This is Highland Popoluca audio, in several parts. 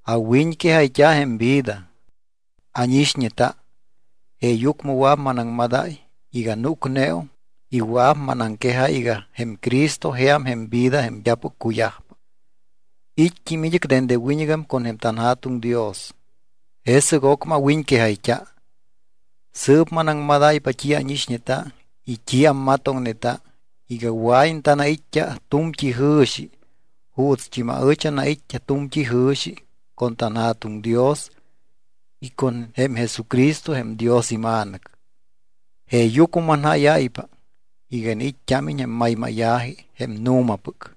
Awiñquejayt́a jém vida. Ánixñeta, jeeyucmɨ wɨa̱p manaŋmadáy iga núcneum y wɨa̱p manaŋquejáy iga jém Cristo jeam jém vida jém d́apɨc cuyajpa. It́t́im id́ɨc dende wiñɨgam con jém tanJa̱tuŋ Dios, jesɨc ocmɨ awiñquejayt́a. Sɨɨp manaŋmadáypa t́i ánixñeta y t́i ammatoŋneta iga wɨa̱iñ tanait́t́a tu̱mt́i jɨ̱xi juutst́im aɨch anait́t́a tu̱mt́i jɨ̱xi con tanJa̱tuŋ Dios y con jém Jesucristo jém Dios iMa̱nɨc. Jeeyucmɨ manjáyáypa iga iniit́t́ámiñ jém maymáya̱ji jém nu̱mapɨc.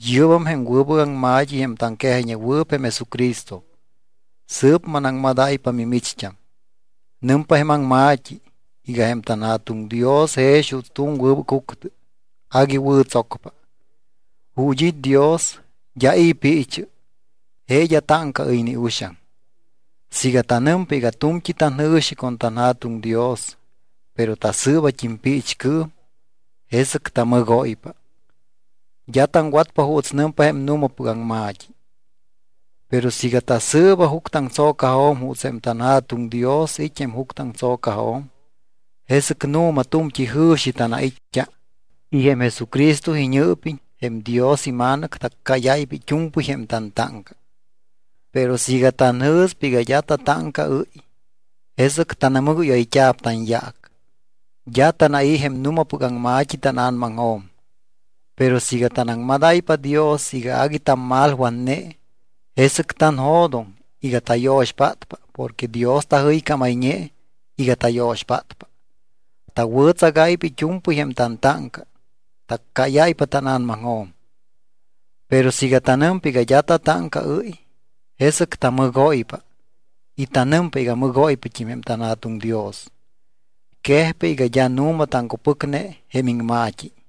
Yɨ́bam jém wɨbɨc aŋma̱t́i jém taŋquejayñewɨɨp jém Jesucristo. Sɨɨp manaŋmadáypa mimicht́am. Nɨmpa jém aŋma̱t́i iga jém tanJa̱tuŋ Dios jex juuts tu̱m wɨbɨc juctɨ. Agui wɨ̱ tsocpa. Ju̱t́ it́ Dios d́a i̱ piichɨ, je d́a táŋcaɨ́y ni uxaŋ. Siiga tanɨmpa iga tu̱mt́i tanjɨ̱xi con tanJa̱tuŋ Dios, pero tasɨɨbat́im piichcɨɨm, jesɨc tamɨgóypa. D́a taŋwatpa juuts nɨmpa jém nu̱mapɨc aŋma̱t́i. Pero siiga tasɨɨba juctɨaŋtso̱cajo̱m juuts jém tanJa̱tuŋ Dios it́ jém juctɨaŋtso̱cajo̱m, jesɨc nu̱ma tu̱mt́i jɨ̱xi tanait́t́a y jém Jesucristo iñɨɨpiñ, jém Dios iMa̱nɨc, taccáyáypa it́u̱mpɨy jém tantáŋca. Pero siiga tanjɨ̱spa iga d́a tatáŋcaɨ́y, jesɨc tanamɨgóyayt́a̱p tanyaac. D́a tanai̱ jém nu̱mapɨc aŋma̱t́i tána̱namaŋjo̱m. Pero siiga tanaŋmadáypa Dios iga agui tammalwatne, jesɨc tanjo̱doŋ iga tayo̱xpátpa porque Dios tajɨycámayñe iga tayo̱xpátpa. Tawɨ̱tsagáypa it́u̱mpɨy jém tantáŋca, taccáyáypa tána̱namaŋjo̱m. Pero siiga tanɨmpa iga d́a tatáŋcaɨ́y, jesɨc tamɨgóypa y tanɨmpa iga mɨgóypat́im jém tanJa̱tuŋ Dios. Quejpa iga d́a nu̱ma taŋcupɨcne jém iŋma̱t́i.